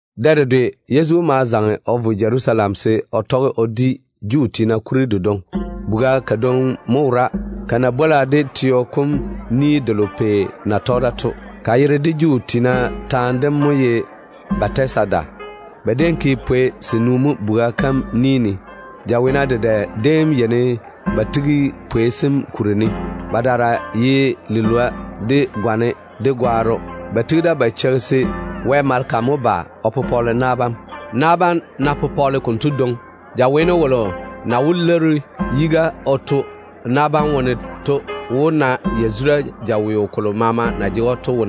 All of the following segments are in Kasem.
Dɛ dedwe Yezu ma zaŋe o vo Jerusalem se o tɔge o di Juu tiina kuri dedwoŋi. Chɔgɔ kodwoŋi mo wora, ko na bwola de teo kom ni delo yere na ye ‘Pei Ni dem’ to. Ko yere de Juu tiina taane dem mo ye Bɛtezada. Ba déem tei pwei senu mo chɔgɔ kom ni ne. Jaweena dedɛ déem yeini ba tigi pwei sem kuri ne. Badaara ye lilwoa, de gwane, de gwaaro. [Ba tigi da ba cheiga se Wɛ maleka mo ba o pɔgele na bam. Na bam ná pɔgele konto dwoŋi, jaweeno wolo na wó lwoori yiga o tu na bam wone to wó na yazura de jaweo kolo maama na jege‑o to.]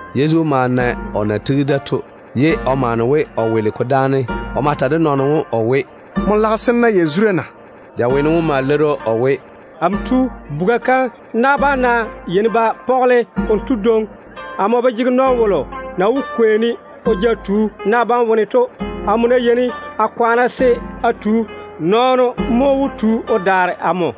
Yezu ma na o na tigi da to, ye o maane we o weele ko dáane. O ma ta de nɔɔno wom o we, “Nmo lage se n na yazura na?” Jaweeno wom ma leiri‑o o we, “Amo tu, chɔgɔ kom na bam ná yeini ba pɔgele konto dwoŋi, amo ba jege nɔɔno wolo na wó kwei-ne o ja tu na bam wone to. Amo ná yeini a kwaane se a tu, nɔɔno mo wó tu lela o daare amo.”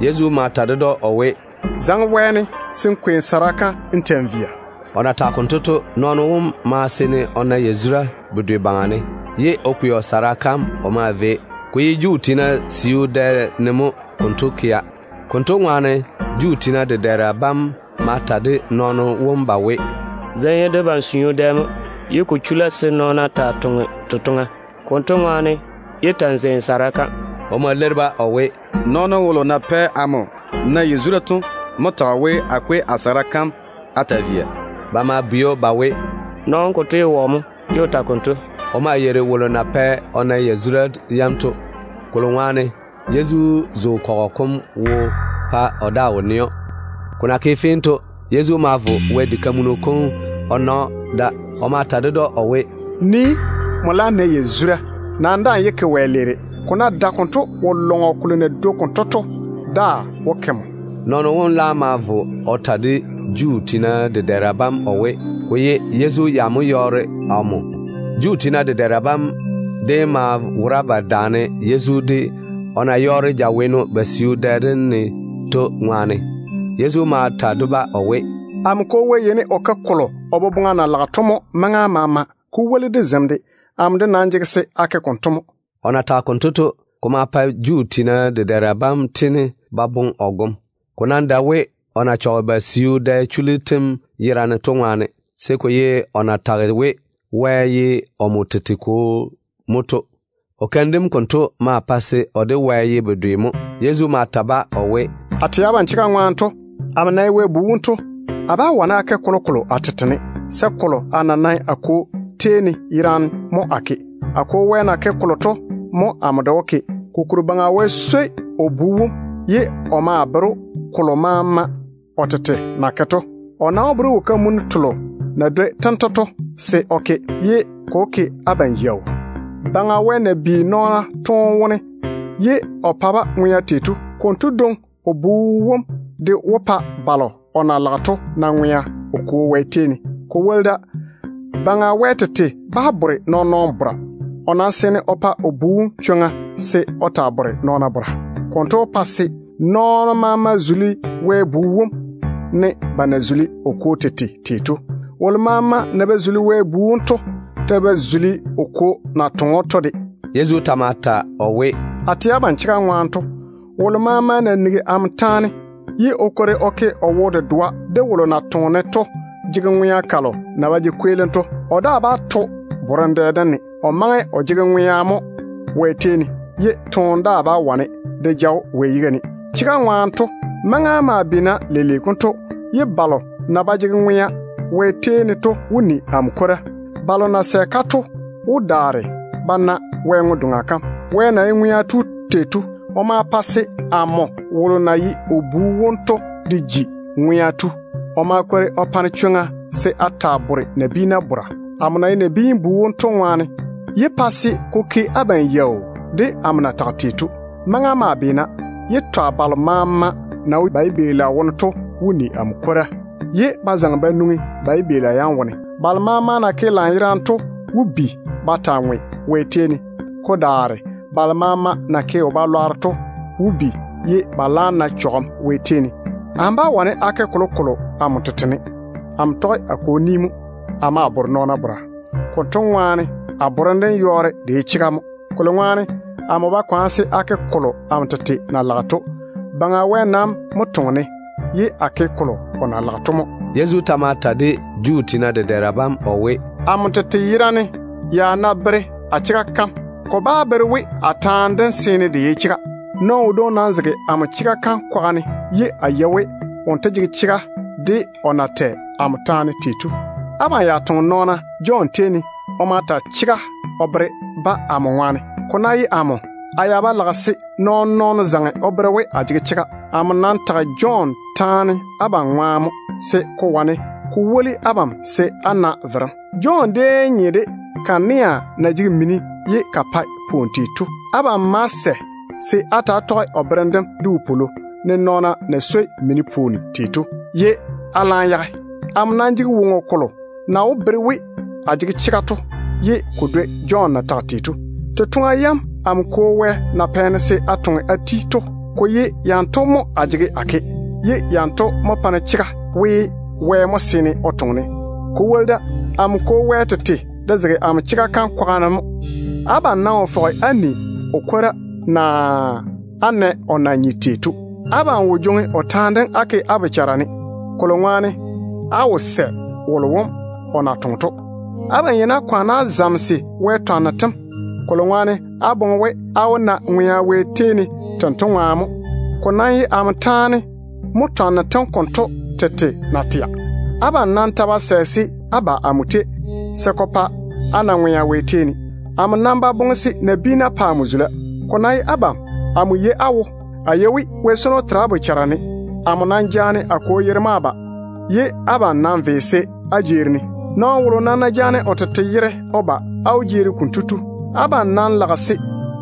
Yezu ma ta ded‑o o we, “Zaŋe wɛɛne se n kwei n sara kam n ta‑n via.” O na tage konto to, nɔɔno wom ma seene o na yazura bedwe baŋa ne, ye o kwei o sara kam o maa via. Ko déem ye Juu tiina siu dɛ ne mo konto kea. Konto ŋwaane Juu tiina dedɛɛra bam ma ta de nɔɔno wom ba we, “Zem ye debam siu dɛ mo, ye ko chula se nɔɔno taa toŋe totoŋa. Konto ŋwaane, yé ta‑n zei n sara kam.” O ma leiri-ba o we, “Nɔɔno wolo na pɛ amo na yazura to mo tage we, a kwei a sara kam a taa via.” Ba ma bwei‑o ba we, “Nɔɔno wom konto ye wɔ mo, ye o ta konto?” O maa yeiri wolo na pɛ o na yazura yam to, kolo ŋwaane Yezu zo nɔn-kɔgɔ kom wo pa o daa wo nɛ‑o. Ko na ke fee to, Yezu ma vo Wɛ diga kam o na‑o da. O ma ta ded‑o o we, “Nii mo! Nmo laam nɛ yazura. Nam daa‑n yé ke wɛleere. Ko ná dae konto, wo-lɔŋɔ kolo na dwoi konto to daa wó ke nmo.” Nɔɔno wom laam ma vo o ta de Juu tiina dedɛɛra bam o we, ko ye Yezu ya mo yɔɔre omo. Juu tiina dedɛɛra bam déem maa wora ba daane Yezu, o na yɔɔre jaweeno ba siu dɛ dem ne to ŋwaane. Yezu ma ta-ba o we, “Amo Kwo Wɛ yeini o ke kolo o boboŋa na lage to mo maŋa maama, ko woli de zem de. Amo de nam jege se a ke konto mo.” O na tage konto to, ko ma pa Juu tiina dedɛɛra bam tiini ba boŋe o gom. Ko nam dae we o na chɔge ba siu dɛ chullu tem yerane to ŋwaane, se ko ye o na tage we, Wɛ ye omo tete Kwo mo to. O keim dem konto ma pa se o de Wɛ ye bedwe mo. Yezu ma ta-ba o we, “A tɛ abam chega ŋwaane to, amo na ye Wɛ Bu wom to, a bá wane a ke kolokolo a tete ne, se kolo yerane a na nae a Kwo tei ne to mo a yeini a ke. A Kwo na ke kolo to mo amo de wó ke. Kokuri Baŋa Wɛ swoi o Bu wom, ye o maa bere‑o kolo maama o tete na ke to. O nam wó bere‑o wo-kamunnu telo na dwoi tento to se o ke, pa se ko ke abam yaau. Baŋa Wɛ na bi nɔɔna toone wone ye o pa-ba ŋwea tei to, konto dwoŋi o Bu wom de wó pa balo o na lage to na ŋwea o Kwo Wɛ tei ne. Ko woli da, Baŋa Wɛ tete bá di nɔɔn-nɔɔno bora. O nam seene o pa o Bu wom chwoŋa se o taa di nɔɔna bora. Konto wó pa se nɔɔna maama zuli Wɛ Bu wom, ne ba na zuli o Kwo tete tei to. Wolo maama na ba zuli Wɛ Bu wom to ta ba zuli o Kwo na toŋe‑o to de.” Yezu ta ma ta o we, “A tɛ abam chega ŋwaane to, wolo maama na nigi amo taane ye o daare o ke o wo-dedoa de wolo na toŋe-ne to jege ŋwea kalo na ba jege kweelim to. O daa bá to bora borem dɛ dem ne. O maŋe o jege ŋwea mo Wɛ tei ne, ye toone daa bá wane de ja‑o Wɛ yiga ne. Chega ŋwaane to, maŋa maa beena leile konto, ye balo na ba jege ŋwea Wɛ tei ne to wó ni amo kwora. Balo na sɛ-ka to wó daare ba na Wɛ ŋwe-doŋa kam. Baŋa Wɛ tete na ye ŋwea tu to, o ma pa se amo wolo na ye o Bu wom to de ji ŋwea tu. O ma kwori o pa-ne chwoŋa se a taa bore nabiina bora, amo na ye Nabiin-bu wom to ŋwaane. Yé pa se ko ke abam yaau de amo na tage kolo to. Maŋa maa beena, ye twa balo maama na wo ba yibeela wone to wó ni amo kwora, ye ba zaŋe ba nwoŋi ba yibeela yam wone. Balo maama na ke lanyerane to wó bi ba taa ŋwe Wɛ tei ne. Ko daare balo maama na ke wo-lwanno to wó bi, ye ba laam na chɔgem Wɛ tei ne. Amo bá wane a ke kolokolo amo tete ne. Amo tɔge a Kwo ni mo a maa bore nɔɔna bora. Konto ŋwaane a borem dem yɔɔre de ye chega mo, kolo ŋwaane amo ba kwaane se a ke tei amo tete boboŋa na lage to. Baŋa Wɛ nam toŋe-ne, ye a ke kolo o na lage to mo.” Yezu ta ma ta de Juu tiina dedɛɛra bam o we, “Amo tete yerane ya ná bere a chega kam, ko bá bere we a taane dem seene de ye chega. Nɔɔno wodwoŋi nam zege amo chega kam kwaga ne, ye a yei we wonto jege chega de o na tɛ amo taane tei to. Abam ya toŋe nɔɔna Jɔn tei ne. O ma ta chega o bere-ba amo ŋwaane. Ko ná ye amo, a ya ba lage se nabiinu zaŋe o bere we a jege chega. Amo nam tage Jɔn taane abam ŋwaane mo, se ko wane ko woli abam se á na verem. Jɔn déem nye de kanea na jege mini ye ka pae pwooni tei to. Abam ma sɛ se á ta‑á tɔge o berem dem de wopwolo, ne nɔɔna na swoi mini pwooni tei to, ye á daa wo peene se á da-o. Amo nam jege woŋo kolo na wó bere we a jege chega to ye ko dwoi Jɔn na tage tei to. Totoŋa yam amo Kwo Wɛ na pɛ-ne se a toŋe a ti to, ko ye yanto mo a jege a ke, ye yanto mo pa-ne chega we, Wɛ mo seene o toŋe-ne. Ko woli da, amo Kwo Wɛ tete de zege amo chega kam kwaga ne mo. Abam nam wo fɔge á ni o kwora, naa á nɛ o yibia na nye tei to. Abam wo jwoŋi o taane dem á ke á bochara ne, kolo ŋwaane á wo sɛ wolo wom o na toŋe to. Abam yeini á kwaane á zamese Wɛ twanno tem, kolo ŋwaane á boŋe we á wó na ŋwea Wɛ tei ne tento ŋwaane mo. Ko nam ye amo yera taane mo twanno tem konto tete na tɛa. Abam nam ta ba sɛ se á ba amo tei, se ko pa á na ŋwea Wɛ tei ne. Amo nam ba boŋe se nabiina pa amo zula. Ko ná ye abam, amo yei á wo. A yei we Wɛ swono tera á bochara ne. Amo nam jaane a Kwo yere mo a ba, ye abam nam ve se á jeeri-ne. Nɔɔno wolo nam ná jaane o tete yere o ba, á wó jeeri konto tu. Abam nam lage se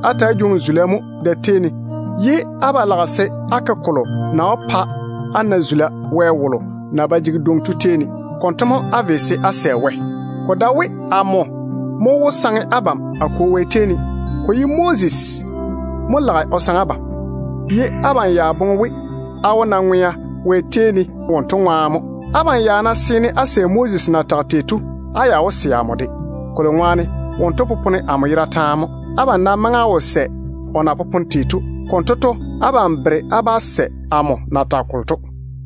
á ta‑á jwoŋi zula mo da-tei ne, ye á ba lage se á ke kolo na wó pa á na zula Wɛ wolo na ba jege dwoŋi to tei ne. Konto mo á ve se á sɛ Wɛ. Ko dae we amo mo wó saŋe abam a Kwo Wɛ tei ne. Ko ye Moses mo lage o saŋe abam, ye abam ya boŋe we á wó na ŋwea Wɛ tei ne wonto ŋwaane mo. Abam ya ná seene á sɛ Moses na tage tei to, á ya wó sɛ amo de, kolo ŋwaane wonto popone amo yera taane mo. Abam nam maŋe á wo sɛ o na popone tei to. Konto to, abam bere á bá sɛ amo na tage kolo to.”